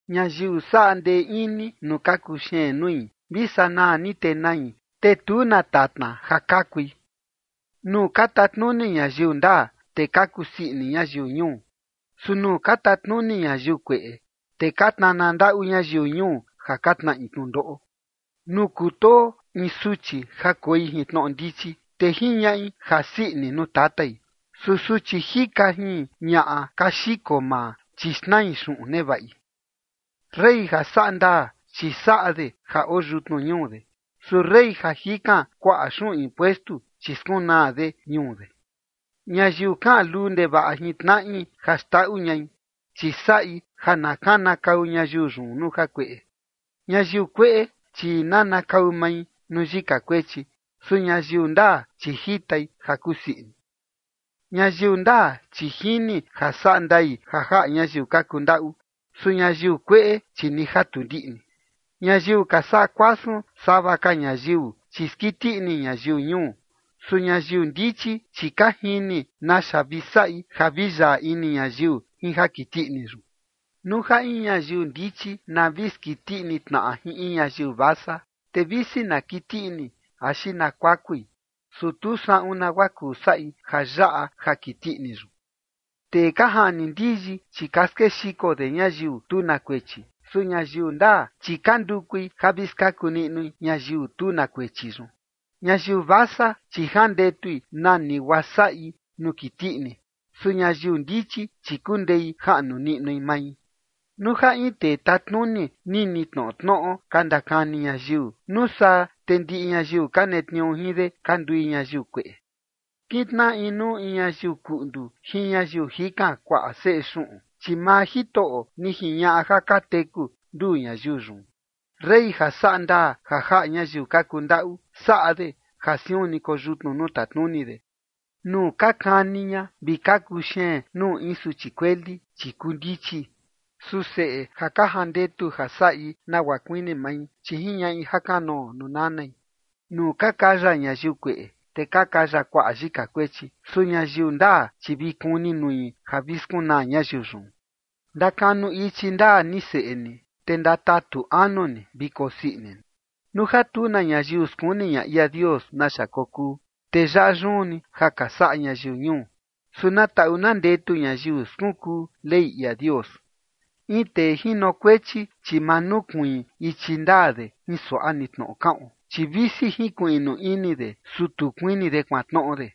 Ñayiu saꞌa ndee ini nuu ka kuxeen nui, vi sanaa ni te nai, te tu na tatna ja kakui. Nuu ka tatnuni ñayiu ndaa, te ka kusii ini ñayiu ñuu. Su nuu ka tatnuni ñayiu kueꞌe, te ka tnana ndaꞌu ñayiu ñuu ja ka tnaꞌi tnundoꞌo. Nuu kutoo in suchi ja koi jin tnoꞌo ndichi, te jiñaꞌi jasii ini nuu tatai. Su suchi jika jin ñaꞌa ka xiko maa, chi xnai xuꞌun nevaꞌi. Rey ja saꞌa ndaa, chi saꞌa de ja oo yutnu ñuu de. Su rey ja jikan kuaꞌa xuꞌun impuestu, chi skunaa de ñuu de. Ñayiu kaꞌan luu ndevaꞌa jin tnaꞌi ja xndaꞌu ñai, chi saꞌi ja na kanakau ñayiu yun nuu jakueꞌe. Ñayiu kueꞌe, chi nanakau mai nuu yika kuechi. Su ñayiu ndaa, chi jitai ja kusii ini. Ñayiu ndaa, chi jini ja saꞌa ndai ja jaꞌa ñayiu ka kundaꞌu. Su ñayiu kueꞌe, chi ni ja tu ndiꞌni. Ñayiu ka saꞌa kuasun sava ka ñayiu, chi skiti ini ñayiu ñuu. Su ñayiu ndichi, chi ka jini naxa vi saꞌi ja vi yaꞌa ini ñayiu jin ja kiti ini yun. Nuu ja in ñayiu ndichi na vi skiti ini tnaꞌa jin in ñayiu vasa, te visi na kiti ini axi na kuakui, su tu saꞌun nagua kuu saꞌi ja yaꞌa ja kiti ini yun. Tee ka jaꞌni ndiyi, chi ka skexiko de ñayiu tu na kuechi. Su ñayiu ndaa, chi ka ndukui ja vi skaku niꞌnui ñayiu tu na kuechi yun. Ñayiu vasa, chi jandetui nani guaa saꞌi nuu kiti ini. Su ñayiu ndichi, chi kundei jaꞌnu niꞌnui mai. Nuu ja in tee tatnuni nini tnoꞌo tnoꞌo ka ndakani ñayiu, nuu saa te ndiꞌi ñayiu ka netniuu jin de, ka ndui ñayiu kueꞌe. Kintnaꞌa inuu ni ñayiu kundaꞌu jin ñayiu jikan kuaꞌa seꞌe xuꞌun, chi maa Jitoꞌo ni jiñaꞌa ja ka teku nduu ñayiu yun. Rey ja saꞌa ndaa ja jaꞌa ñayiu ka kundaꞌu saꞌa de ja siun ni koyutnu nuu tatnuni de. Nuu ka kani ña vi ka kuxeen nuu in suchi kueli, chi kuu ndichi. Su seꞌe ja ka jandetu ja saꞌi nagua kuini mai, chi jiñaꞌi jakanoo nuu nanai. Nuu ka kaya ñayiu kueꞌe, te ka kaya kuaꞌa yika kuechi. Su ñayiu ndaa, chi vi kuni nui ja vi skunaa ñayiu yun. Ndakanu ichi ndaa ni seꞌe ni, te ndatatu anu ni vi kosii ini ni. Nuu ja tu na ñayiu skuni ña ia Dios naxa kokuu, te yaꞌa yun ni ja ka saꞌa ñayiu ñuu. Su na taꞌu na ndetu ñayiu skunkuu Ley ia Dios. In tee jinokuechi, chi ma nukuiin ichi ndaa de jin suaꞌa ni tnoꞌo kaꞌon, chi visi jinkuiꞌnu ini de, su tu kuini de kuantnoꞌo de.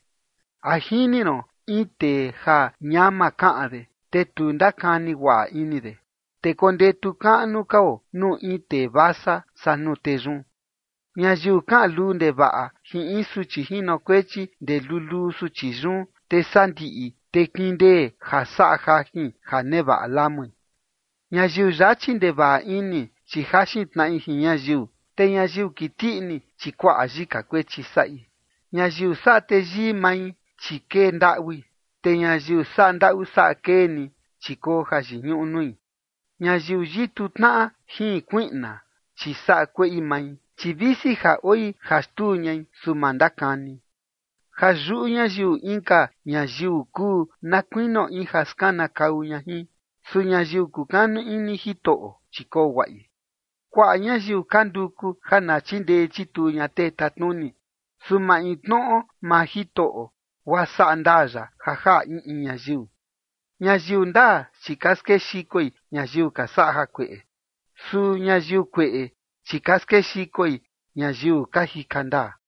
¿A jini ron in tee ja ñama kaꞌan de, te tu ndakani guaꞌa ini de? Te kondetu kaꞌnu kao nuu in tee vasa saa nuu tee yun. Ñayiu kaꞌan luu ndevaꞌa jin in suchi jinokuechi ndee luluu suchi yun, te sandiꞌi te kindee ja saꞌa jajin ja nevaꞌa lamui. Ñayiu yachi ndevaꞌa ini, chi jaxin tnaꞌi jin ñayiu, te ñayiu kiti ini, chi kuaꞌa yika kuechi saꞌi. Ñayiu saꞌa teyii mai, chi kee ndaꞌui, te ñayiu saꞌa ndaꞌu saꞌa kee ni, chi koo jayiñuꞌu nui. Ñayiu yitu tnaꞌa jin kuiꞌna, chi saꞌa kueꞌi mai, chi visi ja oi ja xtuu ñai, su ma ndakani. Ja yuꞌu ñayiu inka ñayiu kuu na kuinio in ja skanakau ña jin. Su ñayiu kukanu ini Jitoꞌo, chi koo guaꞌi. Kuaꞌa ñayiu ka nduku ja na chindee chituu ña tee tatnuni. Su maintnoꞌo maa Jitoꞌo guaa saꞌa ndaa ya ja jaꞌa in in ñayiu. Ñayiu ndaa, chi ka skexikoi ñayiu ka saꞌa jakueꞌe. Su ñayiu kueꞌe, chi ka skexikoi ñayiu ka jika ndaa.